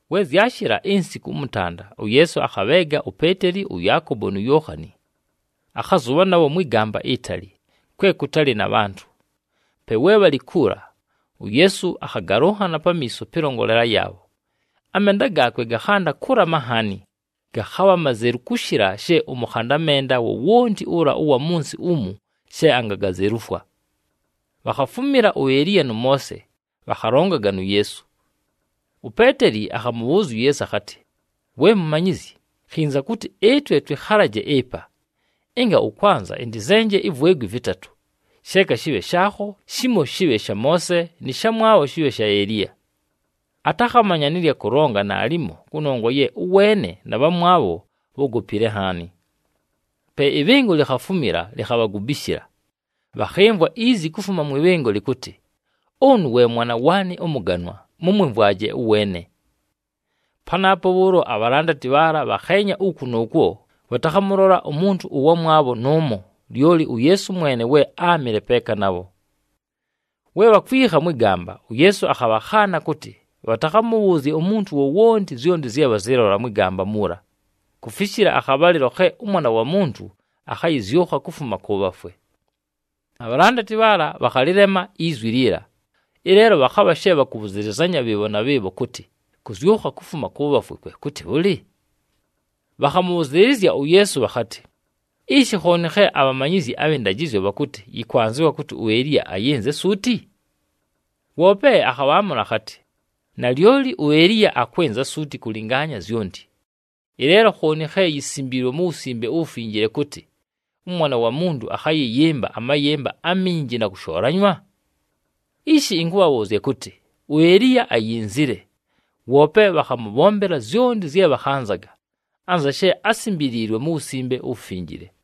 We zyashɨla insiku ʉmʉtanda, uYeesu akhabheega uPeeteli, ʉYaakobo nu Yookhani. Akhazʉbha nabho mwɨ gamba itali, kwe kʉtalɨ na bhantʉ. Pe we bhalɨ kuula, uYeesu akhagalʉnhana pamiiso pɨlongolela yaabho. Amenda gaakwe gakhanda kʉlama nhaani. Gakhabha mazelu kʉshɨla she ʉmʉkhanda menda wowonti ʉla ʉwa mʉ nsɨ umu she angagazelufwa. Bhakhafumila uEliya nʉ Moose, bhakhalongaga nu Yeesu. UPeeteli akhamʉbhʉʉzya uYeesu akhatɨ, “We Mumanyizyi, khinza kʉtɨ ɨtwe twɨkhalaje ɨpa! Ɨnga ʉkwanza, ɨntɨzenje ivwegwi vɨtatʉ: sheeka shɨbhe shaakho, shimo shɨbhe sha Moose, nɨ shamwabho shɨbhe sha Eliya.” Atakhamanya nɨ lya kʉlonga naalimo kʉnongwa ye ʉweene na bhamwabho bhógopile nhaani. Pe ɨbhɨngo likhafumila, likhabhagubishila. Bhakhɨmvwa izi kufuma mwɨ bhɨngo lɨkʉtɨ, “Ʉnʉ we Mwana waanɨ ʉmʉganwa, mʉmwɨmvwaje ʉweene!” Panaapo bhʉʉlo abhalandati bhaala bhakheenya uku nʉʉkwo, bhatakhamʉlola umuntu ʉwamwabho nʉʉmo, lyoli uYeesu mwene we áamɨle peeka nabho. We bhakwikha mwɨ gamba, uYeesu akhabhakhaana kʉtɨ, bhatakhamʉbhʉʉzye umuntu wowonti zyonti zye bhazɨlola mwɨ gamba muula, kufishila akhabhalɨlo khe ʉMwana wa Muntu akhayɨzyʉkha kufuma kʉ bhafwe. Abhalandati bhaala bhakhalɨlema izwi liila. Ɨleelo bhakhabha she bhakʉbhʉzɨlɨzanya bhɨɨbho na bhɨɨbho kʉtɨ, “Kʉzyʉkha kufuma kʉ bhafwe kwe kʉtɨ bhʉlɨ?” Bhakhamʉbhʉzɨɨlɨzya uYeesu bhakhatɨ, “Ishi khooni khe abhamanyizyi abhɨ ndajɨzyo bhakʉtɨ, yɨkwanzɨwa kʉtɨ uEliya ayɨnze suuti?” Woope akhabhaamʉla akhatɨ, “Nalyoli uEliya akwɨnza suuti kʉlɨngaanya zyonti. Ɨleelo khooni khe yisimbiilwe mu Wusimbe uWufinjile kʉtɨ, ʉMwana wa Muntu akhayɨyɨmba amayɨmba aminji na kʉshoolanywa? Ishi ɨnkʉbhabhʉʉzya kʉtɨ, uEliya ayinzile, woope bhakhamʉbhombela zyonti zye bhakhanzaga, anza she ásimbiliilwe mu Wusimbe uWufinjile.”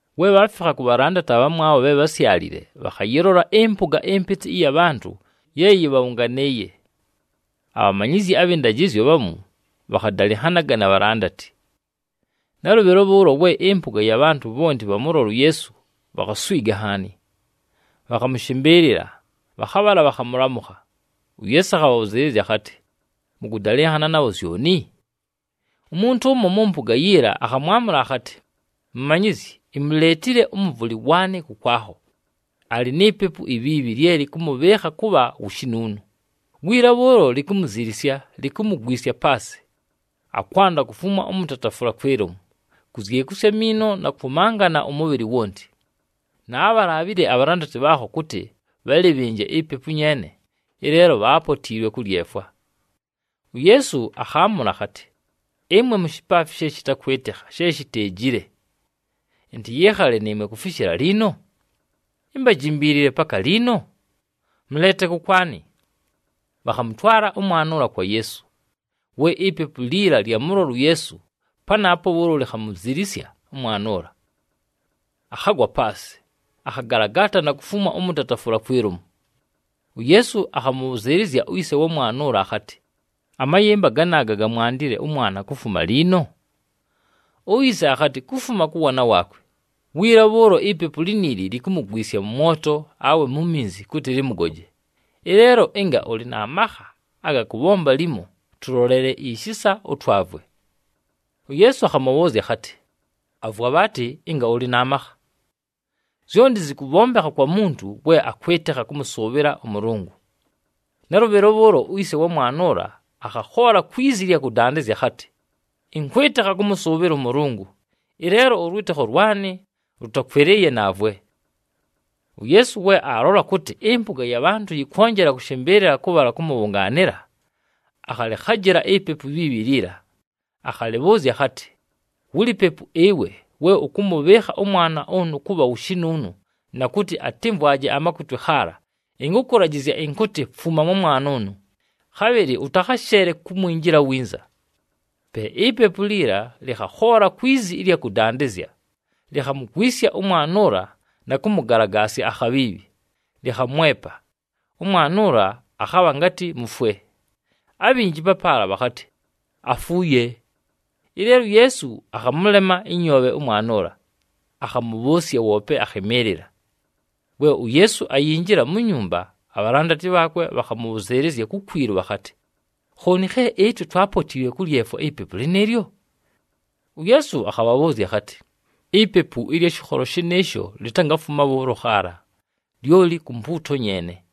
We bhaafikha ku bhalandati abhamwabho bhe bhásyalile, bhakhayɨlola ɨmpʉga ɨmpɨtɨ ɨya bhantʉ ye yɨbhabhʉnganɨɨye. Abhamanyizyi abhɨ ndajɨzyo bhamu bhakhadalɨnhanaga na bhalandati. Nalʉbhɨlo bhʉʉlo we ɨmpʉga ya bhantʉ bhonti bhamʉlola uYeesu, bhakhaswiga nhaani. Bhakhamʉshɨmbɨɨlɨla, bhakhabhala bhakhamʉlamʉkha. UYeesu akhabhabhʉzɨɨlɨzya akhatɨ, “Mʉkʉdalɨnhana nabho zyoni?” Umuntu ʉmo mʉ mpʉga yiila akhamwamʉla akhatɨ, “Mumanyizyi, imuleetile ʉmʉvʉlɨ waanɨ kʉkwakho, alɨ ni pepu ibhiibhi lye lɨkʉmʉbhɨɨkha kʉbha wu shinuunu. Wiila bhʉʉlo likumuzilisya, likumugwisya paasɨ, akwanda kufumwa ʉmʉtatafʉla kwi lomu, kuzyekusya amiino na kwʉmangana ʉmʉbhɨlɨ wonti. Naabhalaabhile abhalandati bhaakho kʉtɨ bhalɨbhɨnje ipepu nyeene, ɨleelo bhaapotiilwe kʉlyefwa.” UYeesu akhaamʉla akhatɨ, “Ɨmwe mushipaafi she shɨtakwɨtɨkha, she shiteejile. Ɨntɨyɨɨkhale nɨɨmwe kufishila liino? Imbajimbiilile paka liino? Mʉleete kʉkwanɨ.” Bhakhamʉtwala ʉmwana ʉla kwa Yeesu. We ipepu liila lyamʉlola uYeesu, panaapo bhʉʉlo likhamuzilisya ʉmwana ʉla. Akhagwa paasɨ, akhagalagaata na kufumwa ʉmʉtatafʉla kwi lomu. UYeesu akhamʉbhʉzɨɨlɨzya uyise wa mwana ʉla akhatɨ, “Amayɨmba ganaaga gamwandile ʉmwana kufuma liino?” Uyise akhatɨ, “Kufuma kʉ waana waakwe. Wiila bhʉʉlo ipepu liniili likumugwisya mʉ mwoto, awe mu minzi kʉtɨ lɨmʉgoje. Ɨleelo ɨnga ʉlɨ na makha aga kʉbhomba limo, tʉlolele ishisa, ʉtwavwe.” UYeesu akhamʉbhʉʉzya akhatɨ, “Avwa bhaatɨ, ɨnga ʉlɨ na makha! Zyonti zɨkʉbhombekha kwa muntu we akwɨtɨkha kʉmʉsʉʉbhɨla ʉMʉlʉngʉ.” Nalʉbhɨlo bhʉʉlo uyise wa mwana ʉla akhakhoola kwi zi ɨlya kʉdandɨzya akhatɨ, “Ɨnkwɨtɨkha kʉmʉsʉʉbhɨla ʉMʉlʉngʉ! Ɨleelo ʉlwɨtɨkho lwanɨ lʉtakwɨlɨɨye, naavwe.” UYeesu we aalola kʉtɨ ɨmpʉga ya bhantʉ yɨkwonjela kʉshɨmbɨɨlɨla kʉbhala kʉmʉbhʉnganɨla, akhalɨkhajɨla ipepu ibhiibhi liila. Akhalɨbhʉʉzya akhatɨ, “Wulipepu ɨwe, we ʉkʉmʉbhɨɨkha ʉmwana ʉnʉ kʉbha wu shinuunu na kʉtɨ atɨmvwaje amakutwe khaala, ɨnkʉkʉlajɨzya ɨnkʉtɨ, fuma mwa mwana ʉnʉ, khabhɨlɨ ʉtakhasheele kumwinjila winza.” Pe ipepu liila lɨkhakhoola kwi zi ɨlya kʉdandɨzya, likhamugwisya ʉmwana ʉla na kʉmʉgalagasya akhabhiibhi, lɨkhamwepa. Ʉmwana ʉla akhabha ngatɨ mufwe, abhinji papaala bhakhatɨ, “Afuuye!” Ɨleelo uYeesu akhamʉlema ɨnyoobhe ʉmwana ʉla, akhamʉbhʉʉsya, woope akhɨmɨɨlɨla. We uYeesu ayinjila mu nyumba, abhalandati bhaakwe bhakhamʉbhʉzɨɨlɨzya kukwilu bhakhatɨ, “Khooni khe ɨtwe twaapotiilwe kʉlyefwa ipepu lɨnɨɨlyo?” UYeesu akhabhabhʉʉzya akhatɨ, “Ipepu ɨlya shɨkholo shɨnɨɨsho litangafuma bhʉʉlo khaala, lyoli ku mpuuto nyeene.”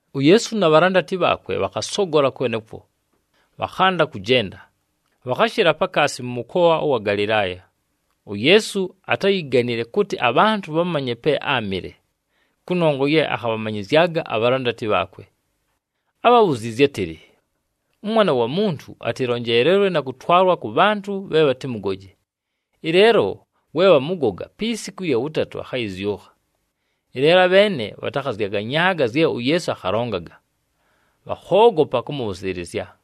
UYeesu na bhalandati bhaakwe bhakhasogola kwenekwo, bhakhanda kʉjenda, bhakhashɨla pakaasi mʉ mʉkoa ʉwa Galɨlaaya. UYeesu atáyiganile kʉtɨ abhantʉ bhamanye pe áamɨle, kʉnongwa ye akhabhamanyɨzyaga abhalandati bhaakwe. Ábhabhuziizye átɨlɨ, “ɄMwana wa Muntu atɨlonjeelelwe na kʉtwalwa kʉ bhantʉ bhe bhatɨmʉgoje. Ɨleelo we bhamʉgoga, pi siku ɨlya wʉtatʉ, akhayɨzyʉkha.” Ɨleelo abheene bhatakhazyaganyaaga zye uYeesu akhalongaga, bhakhoogopa kʉmʉbhʉzɨɨlɨzya.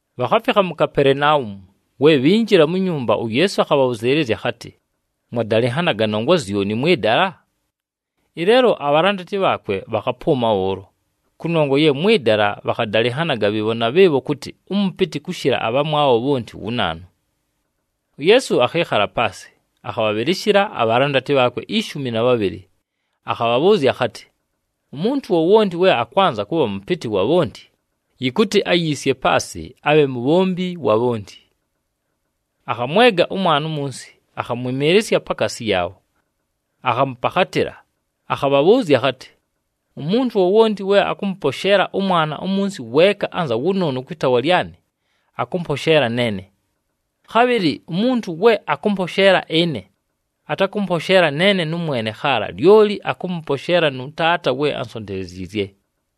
Bhakhafikha mu Kapelenaumu, we bhinjila mu nyumba, uYeesu akhabhabhʉzɨɨlɨzya akhatɨ, “Mwadalɨnhanaga nongwa zyoni mwɨ dala?” Ɨleelo abhalandati bhaakwe bhakhapʉʉma bhʉʉlo, kʉnongwa ye mwɨ dala bhakhadalɨnhanaga bhɨɨbho na bhɨɨbho kʉtɨ, ʉmʉpɨtɨ kʉshɨla abhamwabho bhonti wu naanu. UYeesu akhɨɨkhala paasɨ, akhabhabhɨlɨshɨla abhalandati bhaakwe ishumi na bhabhɨlɨ. Akhabhabhʉʉzya akhatɨ, “Umuntu wowonti we akwanza kʉbha mʉpɨtɨ wa bhonti, yɨkʉtɨ ayiisye paasɨ, abhe mubhombi wa bhonti.” Akhamwega ʉmwana umunsi, akhamwɨmɨɨlɨsya pakaasi yaabho. Akhamʉpakhatɨla, akhabhabhʉʉzya akhatɨ, “Umuntu wowonti we akʉmʉposheela ʉmwana umunsi weeka anza wʉnʉʉnʉ kwɨ taawa lyanɨ, akʉmposheela neene. Khabhɨlɨ umuntu we akʉmposheela ɨne, atakʉmposheela neene nʉmwene khaala, lyoli akʉmposheela nʉ Taata we ansonteleziizye.”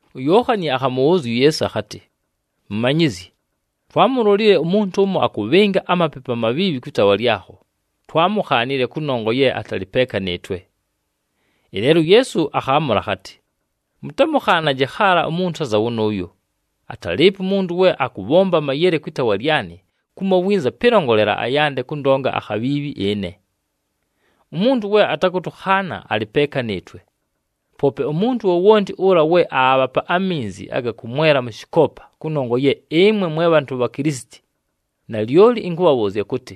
UYookhani akhamʉbhʉʉzya uYeesu akhatɨ, “Mumanyizyi, twaamulolile umuntu ʉmo akʉbhɨnga amapepu amabhiibhi kwɨ taawa lyakho, twaamukhaanile, kʉnongwa ye atalɨ peeka nɨɨtwe.” Ɨleelo uYeesu akhaamʉla akhatɨ, “Mʉtamʉkhaanaje khaala umuntu anza wʉnʉʉyo. Atalɨɨpo umuntu we akʉbhomba amayele kwɨ taawa lyanɨ, kumo winza pɨlongolela, ayande kʉndonga akhabhiibhi ɨne. Umuntu we atakʉtʉkhaana, alɨ peeka nɨɨtwe. Poope umuntu wowonti ʉla we aabhapa aminzi aga kʉmwela mʉ shɨkoopa kʉnongwa ye ɨmwe mwe bhantʉ bha Kilisiti, nalyoli ɨnkʉbhabhʉʉzya kʉtɨ,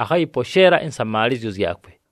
akhayɨposheela ɨnsamaalɨzyo zyakwe.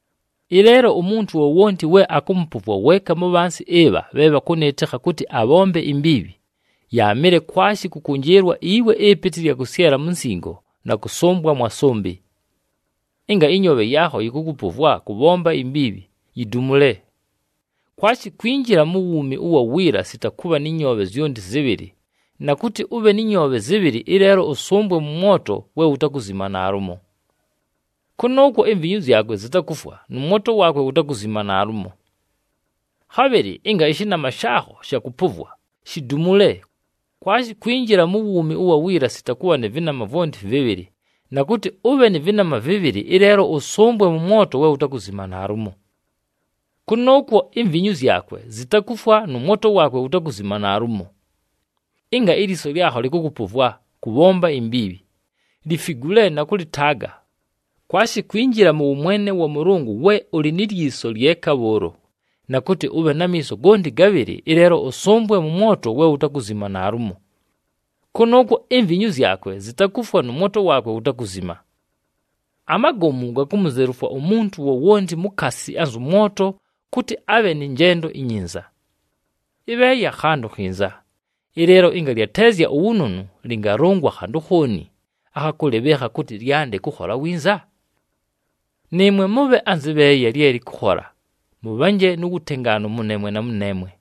“Ɨleelo umuntu wowonti we akʉmʉpʉvwa weeka mu bhansi ɨbha bhe bhakʉnɨɨtɨkha kʉtɨ abhombe imbiibhi, yaamɨle kwashi kʉkʉnjɨɨlwa iwe ɨpɨtɨ ɨlya kʉsyela mu nsingo na kʉsʉmbwa mwa sʉmbɨ. Ɨnga ɨnyoobhe yaakho yɨkʉkʉpʉvwa kʉbhomba imbiibhi, yidumule. Kwashi kwinjila mu wuumi ʉwa wiila sita kʉbha nɨ nyoobhe zyonti zɨbhɨlɨ, na kʉtɨ ʉbhe nɨ nyoobhe zɨbhɨlɨ, ɨleelo ʉsʉmbwe mʉ mwoto we wutakuzima naalumo. [ Kʉnʉʉkwo imvinyu zyakwe zitakufwa nʉ mwoto waakwe wutakuzima naalumo.] Khabhɨlɨ ɨnga ɨshɨnama shaakho shakʉpʉvwa, shidumule. Kwashi kwinjila mu wuumi ʉwa wiila sita kʉbha nɨ vɨnama vwonti vɨbhɨlɨ, na kʉtɨ ʉbhe nɨ vɨnama vɨbhɨlɨ, ɨleelo ʉsʉmbwe mʉ mwoto we wutakuzima naalumo. [ Kʉnʉʉkwo imvinyu zyakwe zitakufwa nʉ mwoto waakwe wutakuzima naalumo.] Ɨnga ilyiso lyakho lɨkʉkʉpʉvwa kʉbhomba imbiibhi, lifigule na kʉlɨtaaga. Kwashi kwinjila mʉ wʉmwene wa Mʉlʉngʉ we ʉlɨ ni lyiso lyeka bhʉʉlo, na kʉtɨ ʉbhe na miiso gonti gabhɨlɨ, ɨleelo ʉsʉmbwe mʉ mwoto we wutakuzima naalumo. Kʉnʉʉkwo imvinyu zyakwe zitakufwa nʉ mwoto waakwe wutakuzima. Amagomu gakumuzelufwa umuntu wowonti mukaasi anzʉ mwoto kʉtɨ abhe nɨ njendo inyinza. Ɨbheeya khantʉ khinza, ɨleelo ɨnga lyateezya uwunonu, lɨngalʉngwa khantʉ khooni akha kʉlɨbhɨɨkha kʉtɨ lyande kʉkhola winza? Nɨɨmwe mʉbhe anzɨ bheeya lye lɨkʉkhola, mʉbhanje mu wutengaanu mʉneemwe na mʉneemwe.”